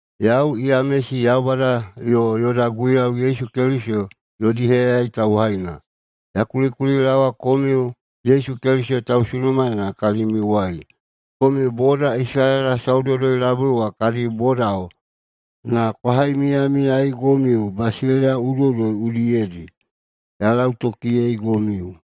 Yau Yamesi, Yaubada yo yoda Guiyau Yesu Keliso yodi heyayai tauhaina. Ya kulikulilaowa komiu Yesu Keliso tausunumaena kalimiuwai. Komiu boda Isalaela saudoudoi-labui wa kadi bodao na kwa haimiyamiyaigomiu basileiya udoiꞌudoi udiyedi: Ya lautokiyeigomiu.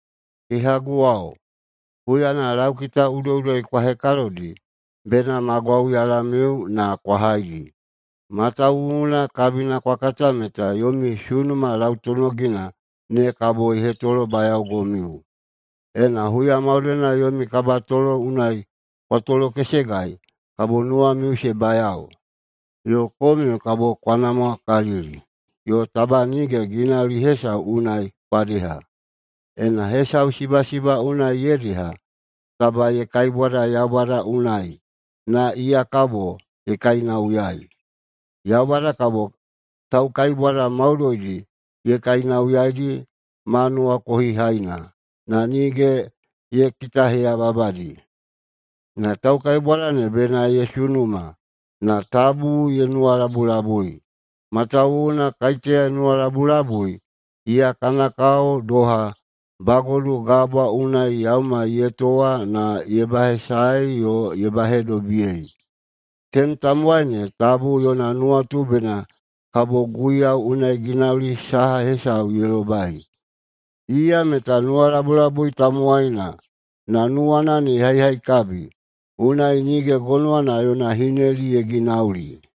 Kehaguwao, huyana laukita udoiꞌudoi kwa hekalodi, bena ma gwauyalamiu na kwa haidi. Matawuwuna kabina kwa kata meta yomi sunuma lautonogina ne kabo ye hetolobayaogomiu. Ena huya maudoina yomi kabatolo unai kwa tolokesegai kabo nuwamiu se bayao yo komiu kabo kwa namwakalili, yo taba nige ginauli hesau unai kwa deha. Ena hesau sibasiba unai ye deha, taba ye kaibwada Yaubada unai, na iya kabo ye kainauyai. Yaubada kabo taukaibwada maudoidi ye kainauyaidi ma nuwakohihaina, na nige ye kitaheyababadi. Na taukaibwada ne bena ye sunuma, na tabu ye nuwalabulabui. Matawuwuna kaiteya ye nuwalabulabui, iya kana kao kabo doha bagodu gabwa unai yaumai ye towa na ye bahesaei yo ye bahedobiyei. Tenem tamowaina ne tabu yona nuwatu bena kabo Guiyau unai ginauli saha hesau ye lobai. Iya meta nuwalabulabui tamowaina na nuwana ne ye haihaikabi, unai nige gonowana yona hineli ye ginauli.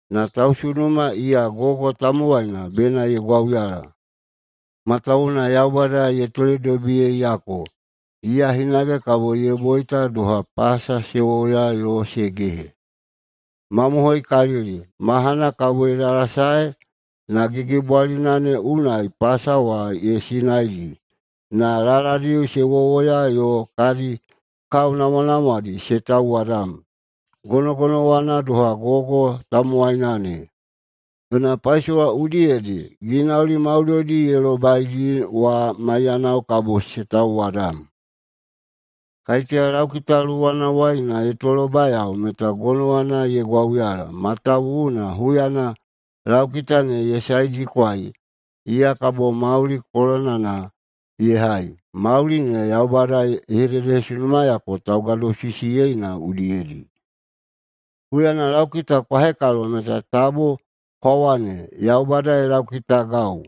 Na tausunuma iya gogo tamowaina bena ye gwauyala, matawuwuna Yaubada ye toledobiyeiyako. Iya hinage kabo ye boita doha pasa se wowoya yo se gehe. Mamohoikalili, mahana kabo ye dalasae na gigibwalina ne unai pasa wa ye sinaidi, na laladi se wowoya yo kadi kao namwanamwadi se tauwadam. Gonogonowana doha gogo tamowaina ne. Yona paisowa udiyedi ginauli maudoidi ye lobaidi wa maiyanao kabo se tauwadam. Kaiteya laukita luwanawai na ye tolobayao meta gonowana ye gwauyala, matawuwuna huyana laukita ne ye saedikwai, iya kabo mauli kolonana ye hai. Mauli ne Yaubada ye hededehesunumayako taugadosisiyeina udiyedi. Huyana laukita kwa hekalo meta tabu kwa wane, “Yaubada ye laukitagau.”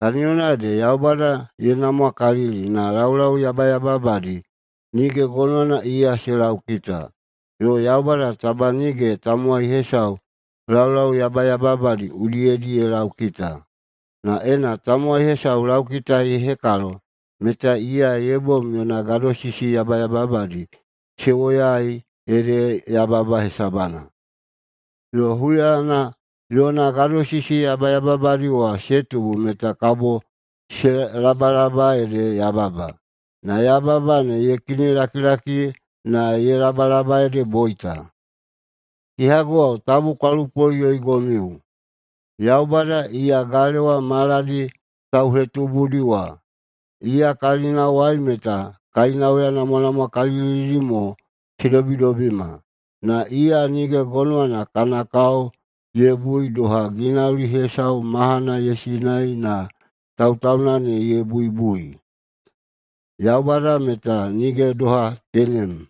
Kaniyona ede Yaubada ye namwakalili na laulau yabayababadi nige gonowana iya se laukita, yo Yaubada taba nige tamowai hesau laulau yabayababadi udiyedi ye laukita. Na ena tamowai hesau laukita ye hekalo meta iya ye bom yona gadosisi yabayababadi se woyaei ede yababa hesabana. Yo huyana yona gadosisi yabayababadi wa se tubu meta kabo se labalaba, ede yababa. Na yababa ne ye kinilakilaki na ye labalaba, ede boita. Kehaguwao, tabu kwa lupoꞌuyoigomiu! Yaubada, iya Galewa maladi tauhetubudi wa, iya kalinawai meta kainauya namwanamwakalilidi mo se dobidobima. Na iya nige gonowana kana kao ye bui doha ginauli hesau mahana ye sinai na tautauna ne ye buibui. [Yaubada meta nige doha tenem.]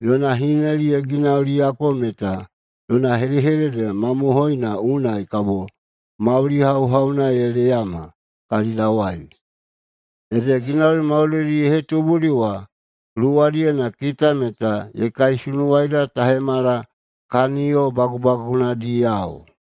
Yona hineli ye ginauliyako meta yona hedehedede mamohoina unai kabo mauli hauhauna ye leyama kalidawai. Ede ginauli maudoidi ye hetubudi wa luwadiyena kita meta ye kaisunuwaida ta hemala kaniyo bagubagunadiyao.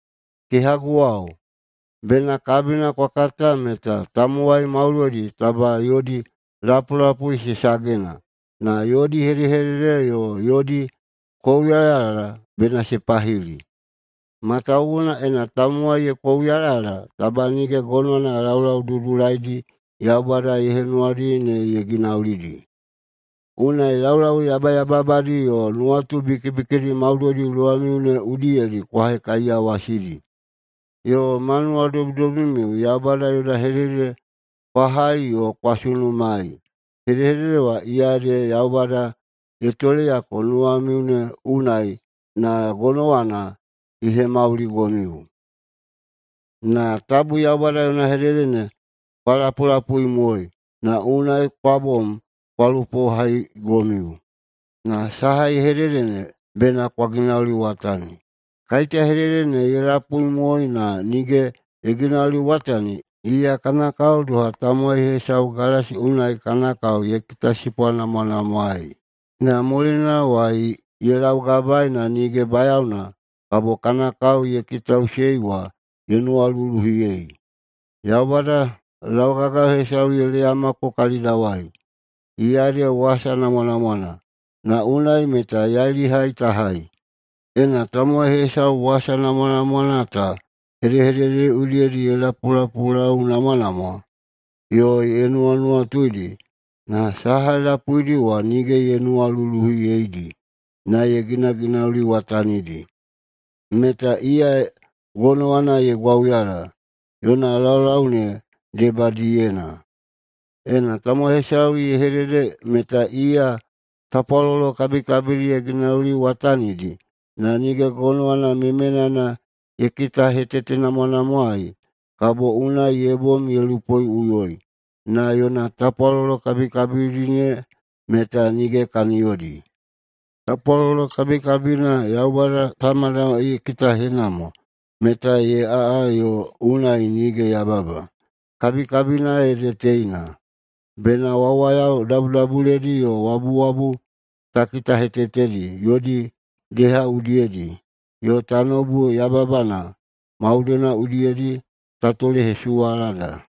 Kehaguwao, bena kabina kwa kata meta tamowai maudoidi taba yodi lapulapui se sagena, na yodi hedehedede yo yodi kouyalayala bena se pahili. Matawuwuna ena tamowai ye kouyalayala, taba nige gonowana laulau dudulaidi Yaubada ye henuwadi ne ye ginaulidi. Unai laulau yabayababadi yo nuwatu bikibikidi maudoidi luwamiu ne udiyedi kwa hekaiyawasidi. Yo ma nuwadobidobimiu Yaubada yona hedehedede kwa hai yo kwa sunumaei. Hedehedede wa iya ede Yaubada ye toleyako nuwamiu ne unai na gonowana ye hemauligomiu. Na tabu Yaubada yona hedehedede ne kwa lapulapuimoei, na unai kwa bom kwa lupohaigomiu. Na saha ye hedede ne bena kwa ginauliwatani. Kaiteya hedehedede ne ye lapuimoei na nige ye ginauliwatani, iya kana kao doha tamowai hesau galasi unai kana kao ye kitasipwanamwanamwaei, na mulinawai ye laugabaei, na nige bayaona kabo kana kao ye kitaꞌusei wa ye nuwaluluhiyei. Yaubada laugagayo hesau ye leyamako kalidawai, iya ede wasa namwanamwana, na unai meta yailihai ta hai. Ena tamowai hesau wasa namwanamwana ta hedehedededi udiyedi ye lapulapulaunamwanamwa yo ye nuwanuwatuidi na saha ye lapuidi wa nige ye nuwaluluhiyeidi, na ye ginaginauliwatanidi, meta iya gonowana ye gwauyala yona laulau ne debadiyena. Ena tamowai hesau ye hedede meta iya tapwalolo kabikabidi ye ginauliwatanidi, na nige gonowana memenana ye kitahetetenamwanamwaei, kabo unai ye bom ye lupoꞌuyoi, na yona tapwalolo kabikabidi ne meta nige kaniyodi. Tapwalolo kabikabina Yaubada Tamada ye kitahenamwa meta ye aꞌa yo unai nige yababa, kabikabina ede teina: Bena wawayao dabudabuledi yo wabuwabu ta kitahetetedi yodi deha udiyedi, yo tanoubu yababana maudoidi udiyedi ta tolehesuwalada.